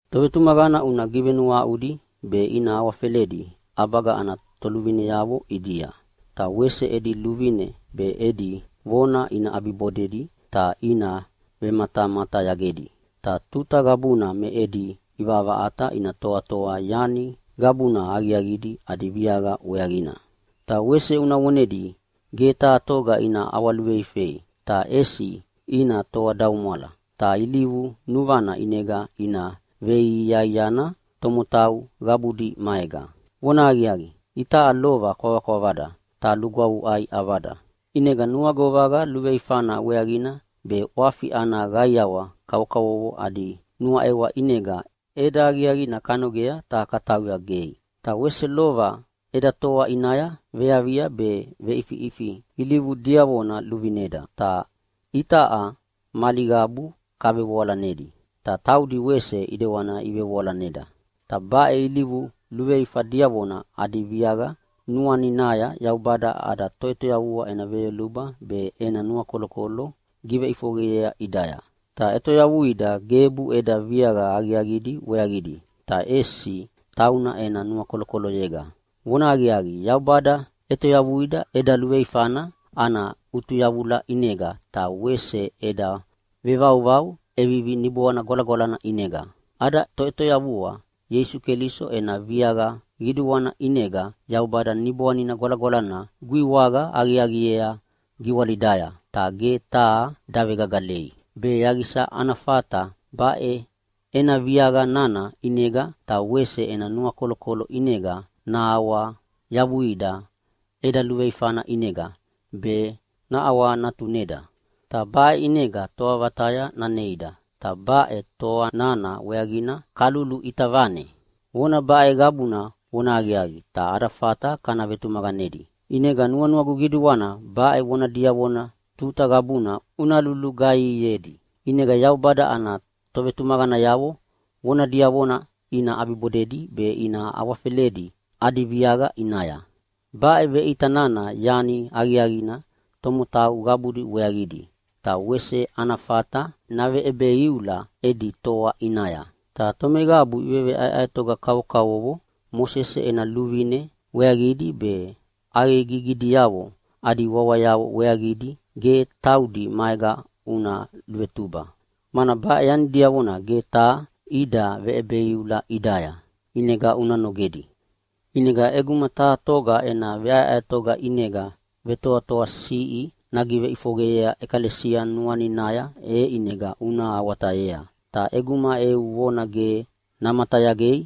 Tovetumaqana una givenuahaʼudi be ina awafeledi ʼabaga ana toluvineavo ʼidia. Ta wese edi luvine be edi vona ina ʼabibodedi ta ina vematamatayagedi, ta tuta qabuna me edi ʼivaʼavaʼata ina toatoa yani qabuna aqiaqidi adi viaqa weaqina. Ta wese una vonedi ge taha toga ina ʼawaluveifei, ta ʼesi ina toadaumwala ta ilivu nuvana ʼinega ina veiaiana tomotau qabudi maega. Vonahaqiaqi, itaʼa lova kwavakwavada ta lugwavuʼai ʼavada, ʼinega nuagovaqa luveifana weaqina be ʼwafi ana qaiawa kavokavovo adi nuaʼewa ʼinega ʼeda aqiaqina kanogea ta katauya gei. Ta wese lova eda toa ʼinaya veavia be veʼifiʼifi ilivu diavona iluvineda. Ta itaʼa mali qabu kavevoalanedi, ta taudi wese ʼidewani ivevoalaneda. Ta baʼe ilivu luveifa diavona adi viaqa nuaninaya Yaubada ada Toʼetoyavua ena veyoluba be ena nuakolokolo giveʼifoqeyea ʼidaya. Ta ʼetoyavuida gebu eda viaqa aqiaqidi weaqidi, ta ʼesi tauna ena nuakolokoloyega. Vonahaqiaqi, Yaubada ʼetoyavuida eda luveifana ana ʼutuyavula ʼinega ta wese eda vevauvau ʼevivi Niboanina Gwalagwalana ʼinega. Ada Toʼetoyavua Ieisu Keliso ena viaqa qiduana ʼinega Yaubada Niboanina Gwalagwalana guiwaqa aqiaqiea giwalidaya, ta ge taha davegagalei, be yaqisa ana fata baʼe ena viaqa nana ʼinega ta wese ena nuakolokolo ʼinega nahawayavuida eda luveifana ʼinega be naʼawanatuneda. Ta baʼe ʼinega toa vataya naneida. Ta baʼe toa nana weaqina kaluluʼita vane. Vona baʼe qabuna vonahaqiaqi ta ada fata kana vetumaqanedi, ʼinega nuanuagu qiduana baʼe vona diavona tuta qabuna una lulugaihiedi. ʼInega Yaubada ana tovetumaqanayavo vona diavona ina ʼabibodedi be ina awafeledi adi viaqa ʼinaya. Baʼe veʼita nana yani aqiaqina tomotau qabudi weaqidi, ta wese ana fata naveʼebeiula edi toa ʼinaya. Ta tomeqabu iveʼaeʼaetoga kavokavovo Mosese ena luvine weaqidi be ʼaqegigidiavo adi wawayavo weaqidi ge taudi maega una luvetuba, mana baʼe yani diavona ge taha ida veʼebeiula ʼidaya, ʼinega una nogedi. ʼInega ʼeguma taha toga ena veʼaeʼaetoga ʼinega vetoatoasiʼi naveʼifoqeyea ʼekalesia nuaninaya e ʼinega una awatayea. Ta ʼeguma eu vona ge namatayagei,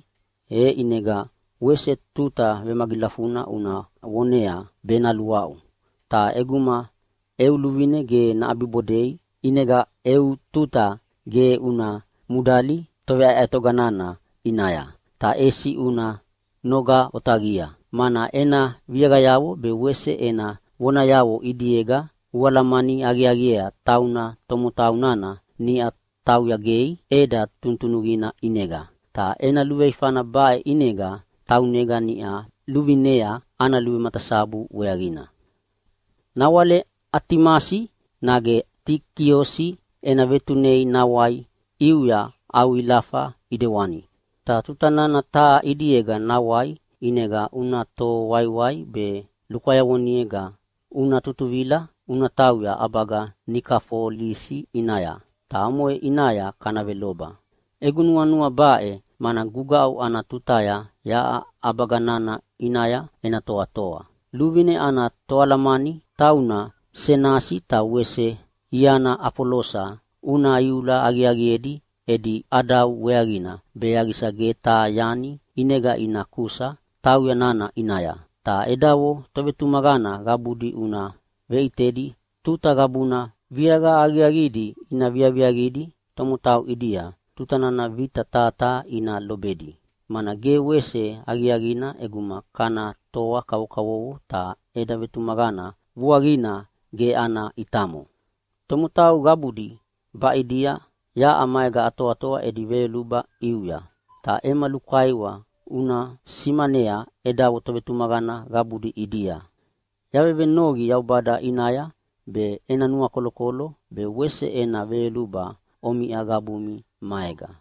e ʼinega wese tuta vemagilafuna una vonea be naluaʼu. Ta ʼeguma eu luvine ge naʼabibodei, ʼinega eu tuta ge una mudali toveʼaeʼaetoga nana ʼinaya, ta ʼesi una noga otaqia. Mana ena viaqayavo be wese ena vonayavo ʼidiega ualamani aqiaqiea tauna tomotau nana niʼa tauya gei ʼeda tunutunuqina ʼinega. Ta ena luveifana baʼe ʼinega taunega niʼa luvinea ana luvematasabu weaqina. Nawale Atimasi nage Tikiosi ena vetunei nawai ʼiuya au ilafa ʼidewani. Ta tuta nana taha ʼidiega nawai ʼinega una toho waiwai be lukwayavonega una tutuvila tauya ʼabaga Nikafolisi ʼinaya, ta omoʼe ʼinaya kana veloba. Egu nuanua baʼe, mana gugaʼu ana tutaya yaʼa ʼabaga nana ʼinaya ena toatoa. Luvine ana toalamani tauna Senasi ta wese iana Afolosa una iula aqiaqiedi edi ʼadau weaqina be yaqisa ge taha yani ʼinega ina kusa tauya nana ʼinaya. Ta edavo tovetumaqana qabudi una veʼitedi tuta qabuna viaqa aqiaqidi ina viaviaqidi tomotau ʼidia tuta nana vita taha taha ina lobedi, mana ge wese aqiaqina ʼeguma kana toa kavokavovo ta eda vetumaqana vuaqina ge ana ʼitamo. Tomotau qabudi baʼidia yaʼa maega atoatoa edi veyoluba ʼiuya. Ta ema lukaiwa una simanea edavo tovetumaqana qabudi ʼidia. Yavevenoqi Yaubada ʼinaya be ena nuakolokolo be wese ena veyoluba omiʼa qabumi maega.